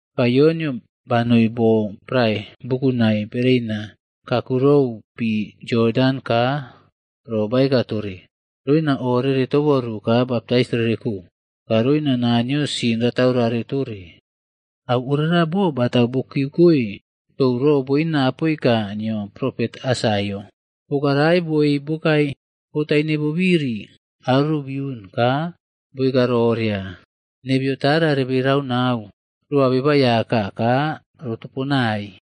Ka Yonꞌyo banoi bo prae bukunai bereina kakurou pi Yodan ka ro baeka tore, roina o rere toboru ka baptais rere ko, ka roina Naniyo sin rataurare tore. Au ora bo botau bo kiyeukoe tou ro boina apoika nio propet Aisaiaꞌo. “Poka rae boei bokae bo taine bobiri aro biun ka boeka roria, ‘Nebeyo tara rebe rau nau roa Beba Aiyaka ka rotoponai.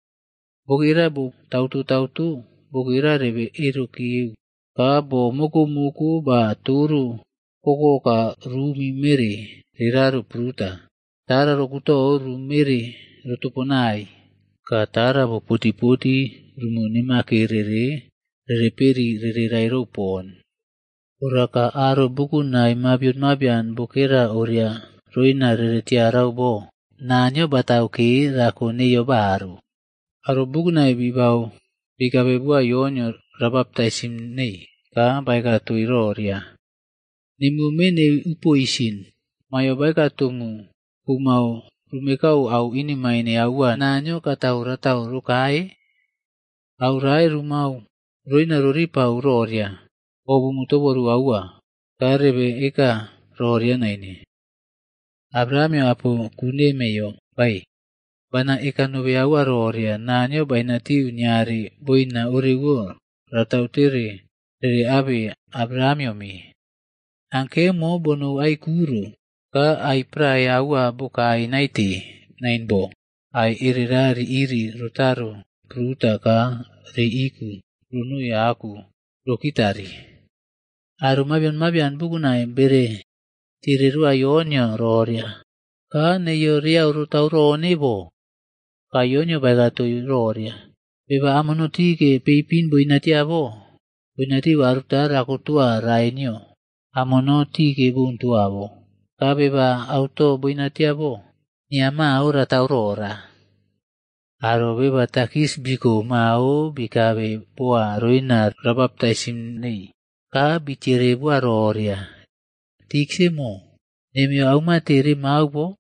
Bokera bo tautoꞌtauto bokera rebeꞌerokeu ka bo mokoꞌmoko ba toro kokoka ruꞌumi mere reraro pruta. Tara ro kutou rumere rotoponai, ka tara bo poty poty rumu nemakere rereperi rere rairou pon. Ora ka aro bukunai mabion mabian bokera oria roina rere tiarau bo Naniyo batau ke rako neiyo baru.’” Aro bukunai bibau bikabe boa Yonꞌyo ra baptaisim nei ka baeka toii roria, “Nemuo me neii u poisin, maiyo baeka tomu kumao rumekau au inemain aua Naniyo katau ratau rokae? Au rae rumao roina ro ripau roria, o bumu toboru aua. Ka rebe eka roria naine, ‘Abrahamꞌyo apo ku nemeiyo bae.’ Bana eka nobe aua roria Naniyo bainatiu niare boina orewo ratau tere rere abe Abrahamꞌyo me. Ankemo bonou ai ku ro ka ai prae aua bekare naite nain bo, ai erera ri iri rotaro pruta ka riiꞌiku ronoi aku rokitari.” Aro mabion mabian bukunai bere tiere roa Yonꞌyo roria, “Ka neiyo reau rotau rone bo?” Ka Yonꞌyo baeka toii roria, “Beba amono tike peipin boinatia bo, boinatiu aruta rakotoa rae nio amono tike boun toa bo. Ka beba auto boinatia bo, nia mao ratau rora.” Aro beba takis biko mao bikabe boa roina ra baptaisim neii. Ka bitiere boa roria, “Tiksaꞌmo, nemeiyo aumate remau bo?”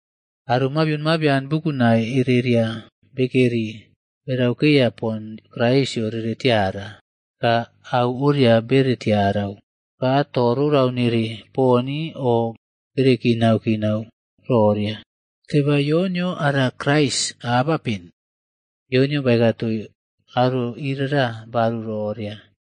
Aro mabian mabion bukunai ereria bekeri beraukeya pon Kraisꞌyo rere tiara. Ka au oria bere tiarau, ka to rorau nere poni o bere kinaꞌkinau roria, “Teba Yonꞌyo ara Kraisd abapen?” Yonꞌyo baeka toii aro iria baru roria,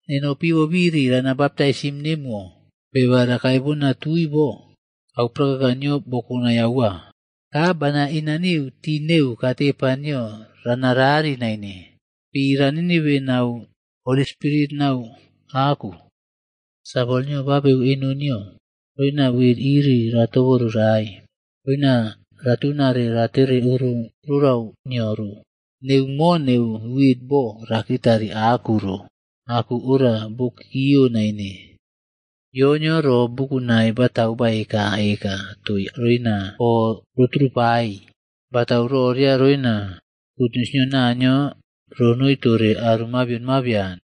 “Neno pi bobiri rana baptaisim nemuwo, beba rakae bona tui bo au prakaka nio bo kokonai aua. Ka bana inaniu tii neu katepa nio rana rari naine.e Pi ranitibe nau Holi Spirit nau aku. Sawol nio ba abeu eno nio roina wit iri ra toborurae roina ratunare ratere oro auto rorau nio ro. Neu mo neu wit bo rakitari aku ro aku ora bokiꞌkiyo naine.” Yonꞌyo ro bukunai batau baekaꞌeka toii roina o roturupai. Batau roria roina gutnius nio Naniyo ronoi tore aro mabion mabian.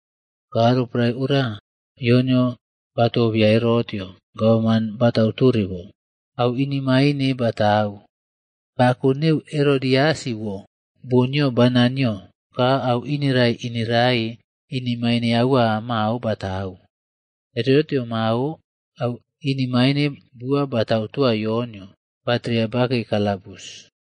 Ka roporae ora, Yonꞌyo batobeya Herotꞌyo, gavana batautore bo, au inemaine batau. Bako neu Herodiasꞌwo bon nio bana nio ka au ineraiꞌinerai inemaine aua mao batatau. Herotꞌyo mao au inemaine bua batau toa Yonꞌyo batereya bakei kalabus.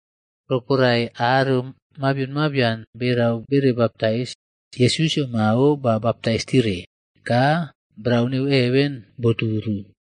Roporae aro mabion mabian berau bere baptais, Yesusꞌyo mao ba baptais tiere. Ka brau neu heven boturu.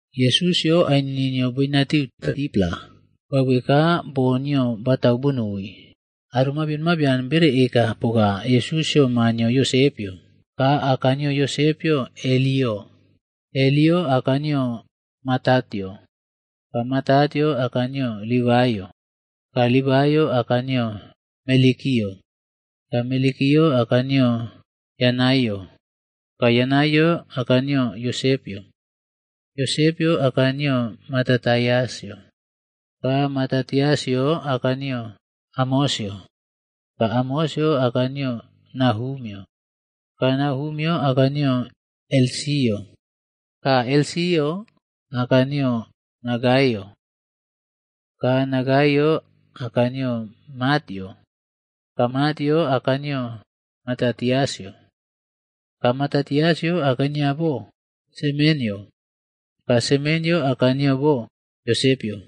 Yesusꞌyo ainini nio boinatiu 30-pla bauwe ka boo nio batau bonoi. Aro mabion mabian bere eka poka Yesusꞌyo ma nio Yosepꞌyo. Ka aka nio Yosepꞌyo Heliꞌyo. Heliꞌyo aka nio Matatꞌyo, ka Matatꞌyo aka nio Livaiꞌyo, ka Livaiꞌyo aka nio Melkiꞌyo, ka Melkiꞌyo aka nio Yanaiꞌyo, ka Yanaiꞌyo aka nio Yosepꞌyo. Yosepꞌyo aka nio Matatiasꞌyo, ka Matatiasꞌyo aka nio Amosꞌyo, ka Amosꞌyo aka nio Nahumꞌyo, ka Nahumꞌyo aka nio Esliꞌyo, Ka Esliꞌyo aka nio Nagaiꞌyo. Ka Nagaiꞌyo aka nio Matꞌyo, ka Matꞌyo aka nio Matatiasꞌyo, ka Matatiasꞌyo aka nio bo Semenꞌyo, ka Semenꞌyo aka nio bo Yosepꞌyo,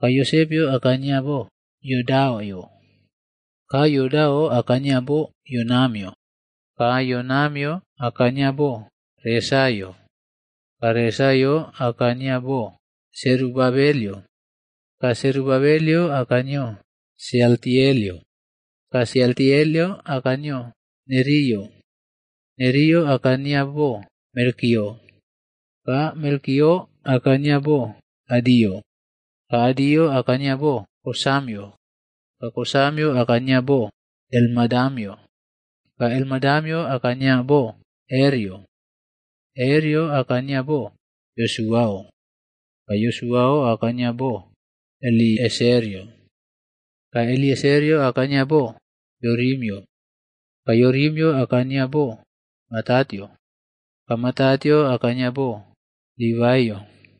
ka Yosepꞌyo aka nio Yodaꞌo. Ka Yodaꞌo aka nio bo Yonamꞌyo, ka Yonamꞌyo aka nio bo Resaꞌo, ka Resaꞌo aka nio bo Serubabelꞌyo, ka Serubabelꞌyo aka nio Sealtielꞌyo, ka Sealtielꞌyo aka nio bo Neriꞌyo. Neriꞌyo aka nio bo Melkiꞌyo, ka Melkiꞌyo aka nio bo Adiꞌyo, ka Adiꞌyo aka nio bo Kosamꞌyo, ka Kosamꞌyo aka nio bo Elmadamꞌyo, ka Elmadamꞌyo aka nio bo Erꞌyo. Erꞌyo aka nio bo Yosuaꞌo, ka Yosuaꞌo aka nio bo Elieserꞌyo, ka Elieserꞌyo aka nio bo Yorimꞌyo, ka Yorimꞌyo aka nio bo Matatꞌyo, ka Matatꞌyo aka nio bo Livaiꞌyo.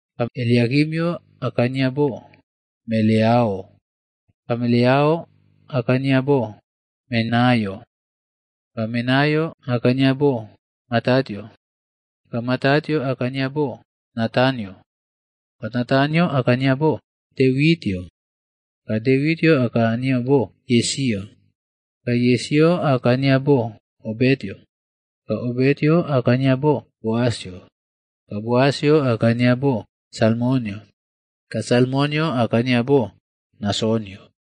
Ka Eliakimꞌyo aka nio bo Meleaꞌo, ka Meleaꞌo aka nio bo Menaꞌyo, ka Menaꞌyo aka nio bo Matataꞌyo, ka Matataꞌyo aka nio bo Natanꞌyo, ka Natanꞌyo aka nio bo Devitꞌyo. Ka Devitꞌyo aka nio bo Yesiꞌyo, ka Yesiꞌyo aka nio bo Obetꞌyo, ka Obetꞌyo aka nio bo Boasꞌyo, ka Boasꞌyo aka nio bo Salmonꞌyo ka Salmonꞌyo aka nio bo Nasonꞌyo.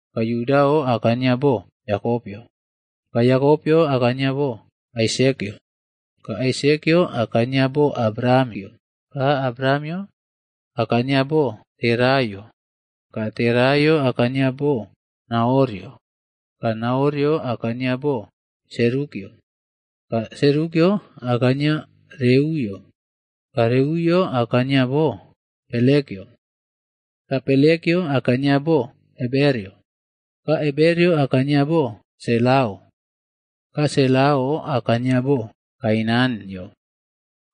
Ka Yudaꞌo aka nio bo Yakopꞌyo, ka Yakopꞌyo aka nio bo Aisekꞌyo, ka Aisekꞌyo aka nio bo Abrahamꞌyo, ka Abrahamꞌyo aka nio bo Teraꞌyo, ka Teraꞌyo aka nio bo Nahorꞌyo. Ka Nahorꞌyo aka nio bo Serukꞌyo, ka Serukꞌyo aka nio bo Reuꞌyo, ka Reuꞌyo aka nio bo Pelekꞌyo, ka Pelekꞌyo aka nio bo Eberꞌyo, ka Eberꞌyo aka nio bo Selaꞌo. Ka Selaꞌo aka nio bo Kainanꞌyo,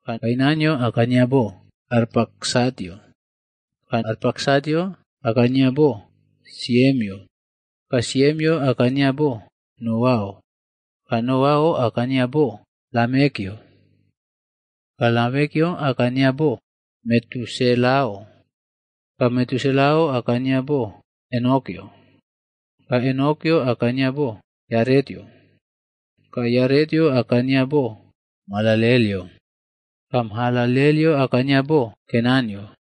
ka Kainanꞌyo aka nio bo Arpaksatꞌyo, ka Arpaksatꞌyo aka nio bo Siemꞌyo, ka Siemꞌyo aka nio bo Noaꞌyo, ka Noaꞌyo aka nio bo Lamekꞌyo. Ka Lamekꞌyo aka nio bo Metuselaꞌyo, ka Metuselaꞌyo aka nio bo Enokꞌyo, ka Enokꞌyo aka nio bo Yaretꞌyo, ka Yaretꞌyo aka nio bo Mahalalelꞌyo, ka Mahalalelꞌyo aka nio bo Kenanꞌyo.